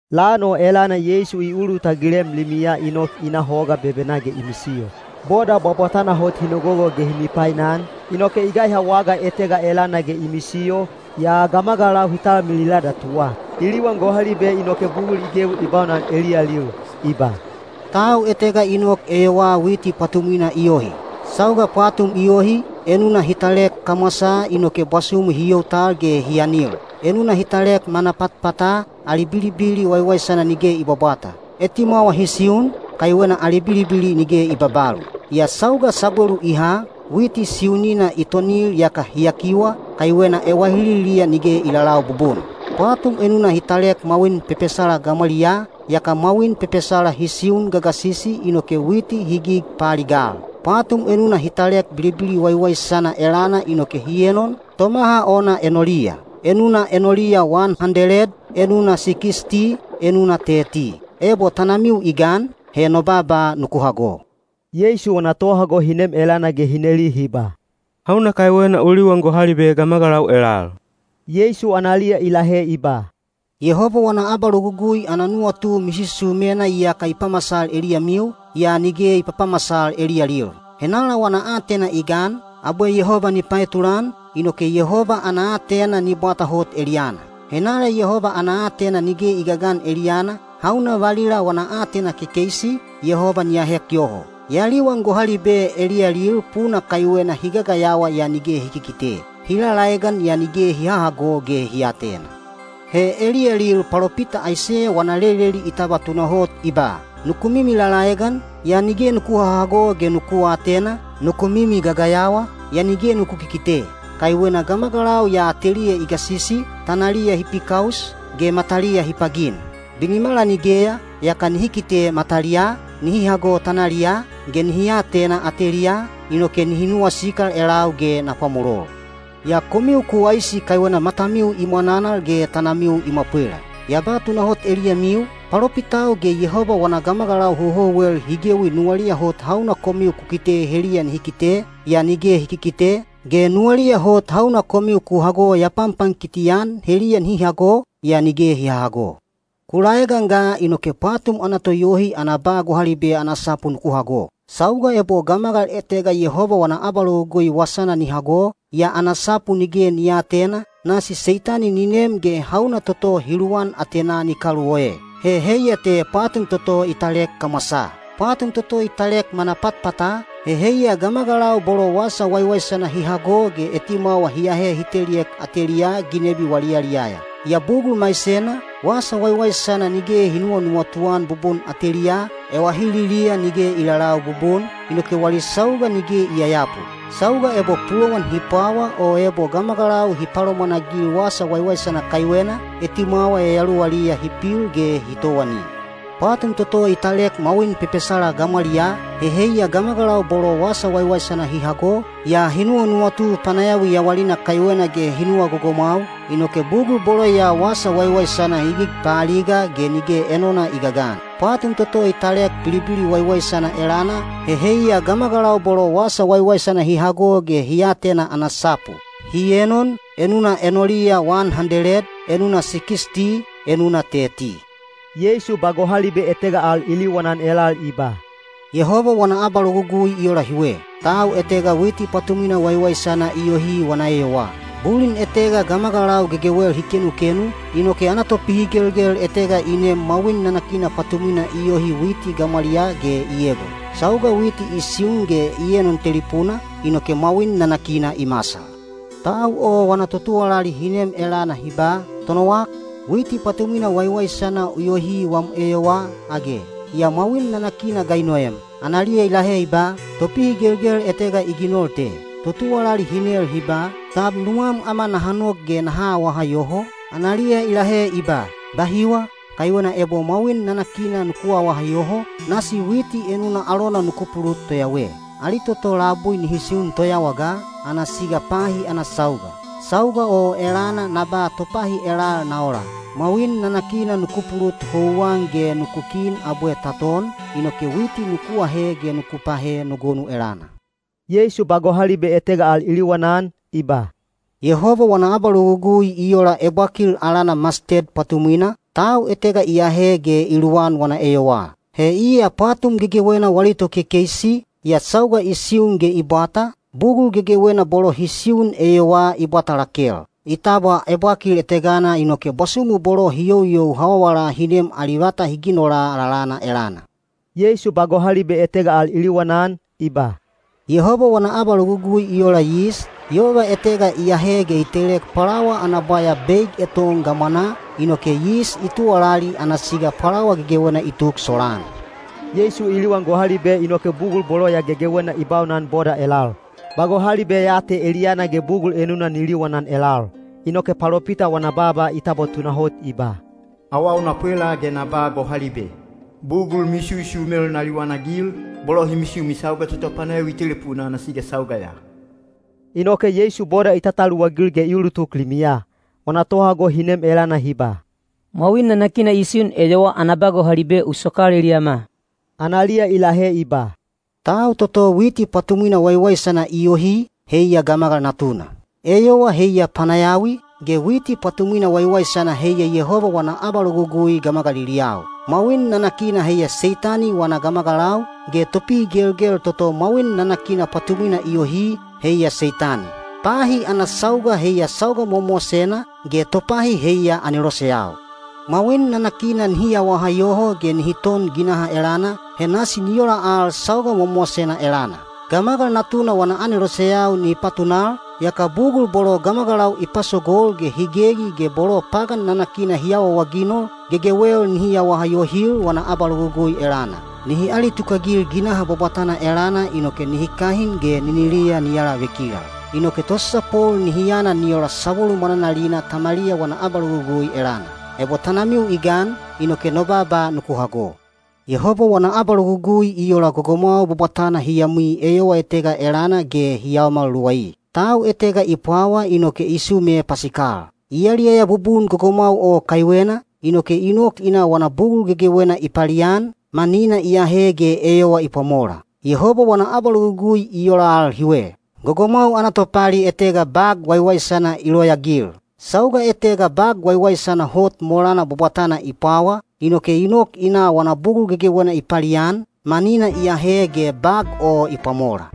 Lan o elana Yeisu i ulutagilem limiya i nok i na hoga bebenaa ge i misiyo. Boda bwabwatana hot hi nogogo ge hi mipainan, inoke i gaiha waga etega elana ge i misiyo, yaa gamagalau hi talmilila datuwa. I liwan gohalibe inoke bugul i gewi i baunan eliyalil. I ba, “Tau etega i nok eyowaa witi pwatumwina i yohi. Sauga pwatum i yohi, enuna hi talek kamwasaa inoke bwasumu hi you tal ge hi anil. Enuna hi talek manapatpata, ali bilibili waiwaisana nige i bwabwata. Etimwawa hi siun, kaiwena ali bilibili nige i babalu. Yaa sauga sabwelu i ha, witi siunina i tonil yaka hi yakiwa, kaiwena ewahililiya nige i lalau bubun. Pwatum enuna hi talek mwawin pepesala gamwaliyaa, yaka mwawin pepesala hi siun gagasisi inoke witi hi gig paaligal. Pwatum enuna hi talek bilibili waiwaisana elana inoke hi enon, tomaha ona enoliya. Enuna enoliya wan handeled, enuna sikisti, enuna teti. Ebo tanamiu i gan, he no baaba nuku hago.” Yeisu wana tohago hi nem elana ge hi neli hi ba, “Hauna kaiwena u liwan gohalibe gamagalau elal?” Yeisu analiya i lahe i ba, “Yehoba wana abalogugui ana nuwatu misusumena iyaka i pamasal eliyamiu, yaa nige i papamasal eliyalil. Henala wana aatena i gan, abwe Yehoba ni paetulan, inoke Yehoba ana aatena ni bwata hot eliyana. Henala Yehoba ana aatena nige i gagan eliyana, hauna valila wana aatena kekeisi, Yehoba ni ahek yoho. Ya liwan gohalibe eliyalil puna kaiwena hi gagayawa yaa nige hi kikite, hi lalaegan yaa nige hi hahago ge hi aatena. He eliyalil palopita Aiseya wana leleli i tabwa tunahot i ba: Nuku mimi lalaegan, yaa nige nuku hahago ge nuku aatena, nuku mimi gagayawa, yaa nige nuku kikite. Kaiwena gamagalau ya ateliya i gasisi, tanaliya hi pikaus, ge mataliya hi pagin. Binimala nigeya, yaka nihi kite mataliyaa, nihi hago tanaliyaa, ge nihi atena ateliyaa, inoke nihi nuwasikal elau ge na pwamolol. Yaa komiu ku waisi kaiwena matamiu i mwananal ge tanamiu i mwapwela. Ya ba tunahot eliyamiu, palopitau ge Yehoba wana gamagalau houhouwel hi gewi nuwaliya hot hauna komiu ku kite heliya nihi kite, yaa nige hi kikite, ge nuwaliya hot hauna komiu ku hago ya panpankiti-an heliya nihi hago, yaa nige hi hahago. Ku laegan ga inoke pwatum ana toyohi ana ba gohalibe ana sapu nuku hago. Sauga ebo gamagal etega Yehoba wana abalogugui wasana ni hago, yaa ana sapu nige ni aatena, nasi Seitani ni nem ge hauna toto hi luwan atenaa ni kaluoe. He heiya te pwatum toto i talek kamwasaa. Pwatum toto i talek manapatpata, he heiya gamagalau bolo wasa waiwaisana hi hago ge etimwawa hi ahe hi teliek ateliyaa ginebi wali yaliyaya. Yaa bugul maisena, wasa waiwaisana nige hi nuwanuwatu-an bubun ateliyaa, ewahililiya nige i lalau bubun, inoke wali sauga nige i yayapu. Sauga ebo pulowan hi pwawa o ebo gamagalau hi palomwanagil wasa waiwaisana kaiwena, etimwawa yayaluwaliya hi pil ge hi towani. Pwatum toto i talek mwawin pepesala gamwaliyaa, he heiya gamagalau bolo wasa waiwaisana hi hago, yaa hi nuwanuwatu panayawi yawalina kaiwena ge hi nuwa gogomwau, inoke bugul bolo ya wasa waiwaisana hi gig paaliga ge nige enona i gagan. Pwatum toto i talek bilibili waiwaisana elana, he heiya gamagalau bolo wasa waiwaisana hi hago ge hi atena ana sapu. Hi enon, enuna enoliya wan handeled, enuna sikisti, enuna teti.” Yeisu ba gohalibe etega al i liwanan elal i ba, “Yehoba wana abalogugui i ola hiwe. Tau etega witi pwatumwina waiwaisana i yohi wana eyowaa. Bulin etega gamagalau gegewel hi kenukenu, inoke ana topihigelgel etega i nem mwawin nanakina pwatumwina i yohi witi gamwaliyaa ge i egon. Sauga witi i siun ge i enon telipuna, inoke mwawin nanakina i masal. Tau o wana totuwalali hi nem elana hi ba, ‘Tonowak, witi pwatumwina waiwaisana u yohi wam eyowaa, age? Yaa mwawin nanakina ga i noem?’ Analiya i lahe i ba, ‘Topihigelgel etega i ginol te.’ Totuwalali hi nel hi ba, ‘Tab nuwam ama naha nok ge naha awaha yoho?’ Analiya i lahe i ba, ‘Bahiwa, kaiwena ebo mwawin nanakina nuku awaha yoho, nasi witi enuna alona nuku pulut toyawe. Ali toto labui nihi siun toyawa ga, ana siga pahi ana sauga. Sauga o elana na ba topahi elal na ola: Mwawin nanakina nuku pulut houwan ge nuku kin abwe ta ton, inoke witi nuku ahe ge nuku pahe no gonu elana.’” Yeisu ba gohalibe etega al i liwanan, i ba, “Yehoba wana abalogugui i ola ebwakil alana masted pwatumwina, tau etega i ahe ge i luwan wana eyowaa. He iya pwatum gegewena wali tokekeisi, yaa sauga i siun ge i bwata, bugul gegewena bolo hi siun eyowaa i bwata lakel. I tabwa ebwakil etegana inoke bwasumu bolo hi youyou hawawala hi nem ali vata hi ginola lalana elana.” Yeisu ba gohalibe etega al i liwanan, i ba, “Yehoba wana abalogugui i ola yis, yova etega i ahe ge i telek pwalawa ana bwaya beig eton gamwanaa, inoke yis i tuwalali ana siga pwalawa gegewena i tuk solaan.” Yeisu i liwan gohalibe inoke bugul bolo ya gegewena i baunan boda elal; ba gohalibe ya te eliyana ge bugul enuna ni liwanan elal. Inoke palopita wana baaba i tabwa tunahot i ba: Awau na pwela ge na ba gohalibe; bugul misusumel na liwanagil, bolo hi misumi sauga toto panayawi i telipuna ana siga sauga ya. Inoke Yeisu boda i tataluwagil ge i ulutuk limiya. Wana tohago hi nem elana hi ba, “Mwawin nanakina i siun eyowaa ana ba gohalibe u sokal eliyama.” Analiya i lahe i ba, “Tau toto witi pwatumwina waiwaisana i yohi, heiya Gamagal Natuna. Eyowa heiya panayawi, ge witi pwatumwina waiwaisana heiya Yehoba wana abalogugui gamagaliliyau. Mwawin nanakina heiya Seitani wana gamagalau, ge topihigelgel toto mwawin nanakina pwatumwina i yohi, heiya Seitani. Pahi ana sauga heiya sauga mowamowasena, ge topahi heiya aneloseyau. “Mwawin nanakina nihi awaha yoho ge nihi ton ginaha elana, he nasi ni ola al sauga mowamowasena elana. Gamagal Natuna wana aneloseyau ni patunal, yaka bugul bolo gamagalau i pasogol ge hi gegi ge bolo pagan nanakina hi awaawaginol, gegewel nihi awaha yohil wana abalogugui elana. Nihi alitukagil ginaha bwabwatana elana inoke nihi kahin ge niniliya ni alavekilal. Inoke tosasapol nihi yana ni ola sabwelu mwananalina Tamaliya wana abalogugui elana. Ebo tanamiu i gan, inoke no baaba nuku hago.” Yehoba wana abalogugui i ola gogomwau bwabwatana hi yamwi eyowa etega elana ge hi yaomal luwai. Tau etega i pwawa inoke i sume pasikal. I yaliyaya bubun gogomwau o kaiwena, inoke i nok i na wana bugul gegewena i palian, manina i ahe ge eyowa i pwamola. Yehoba wana abalogugui i ola al hiwe. Gogomwau ana topali etega bag waiwaisana i loyaagil. Sauga etega bag waiwaisana hot molana bwabwatana i pwawa, inoke i nok i na wana bugul gegewena i palian, manina i ahe ge bag o i pwamola.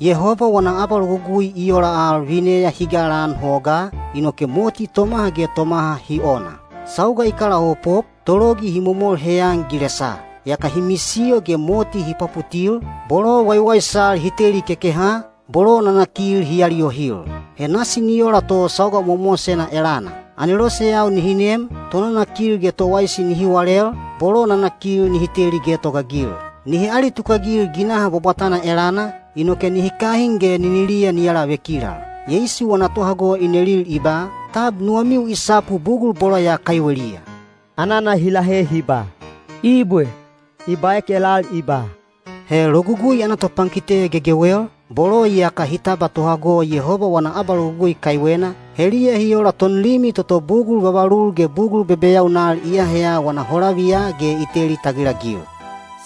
Yehoba wana abalogugui i ola al vineya hi galaan hogaa, inoke moti tomaha ge tomaha hi ona. Sauga i kalaopop, tologi hi momol heyan gilesaa. Yaka hi misiyo ge moti hi pwaputil, bolo waiwaisal hi teli kekeha, bolo nanakil hi aliyohil. He nasi ni ola to sauga mowamowasena elana. Aneloseyau nihi nem, tonanakil ge towaisi nihi walel, bolo nanakil nihi teli getogaagil. Nihi alitukagil ginaha bwabwatana elana, inoke nihi kahin ge niniliya ni alavekilal. Yeisu wana tohago i nelil i ba, “Tab nuwamiu i sapu bugul bolo ya kaiweliya?” Anana hi lahe hi ba, “Ibwe.” I baek elal i ba, “He logugui ana topankite gegewel, bolo iyaka hi tabwa tohago Yehoba wana abalogugui kaiwena, heliya hi ola tonlimi toto bugul vavalul ge bugul bebeyaunal i aheya wana holaviya ge i teli tagilagil.”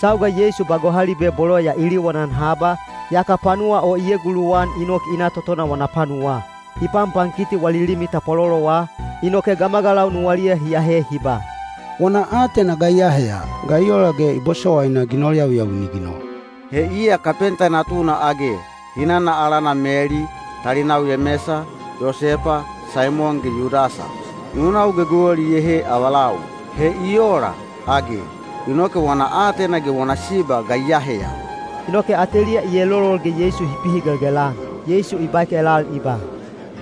Sauga Yeisu ba gohalibe bolo ya i liwanan haba, yaka panuwa o i eguluwan i nok i na totona wana panuwaa. I panpankiti wali limi tapwalolowa, inoke gamagalau nuwaliya hi ahe hi ba, “Wana aatena ga i aheya? Ga i ola ge i bosowaina ginol yawiyawi ni ginol? He iya kapenta natuna age? Hinana alana Meli, talinau Yemesa, Yosepa, Saimon ge Yudasa. Nunau gegewel iyehe avalau. He i ola, age? Inoke wana aatena ge wana siba ga i aheya?” Inoke ateliya i elolol ge Yeisu hi pihigelgel-an. Yeisu i baek elal i ba,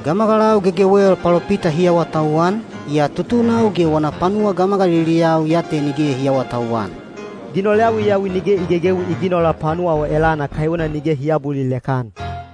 “Gamagalau gegewel palopita hi awatauwan, yaa tutunau ge wana panuwa gamagaliliyau ya te nige hi aawatauwan.” Ginol yawiyawi nige i gegewi i ginola panuwa o elana kaiwena nige hi aabulilek-an.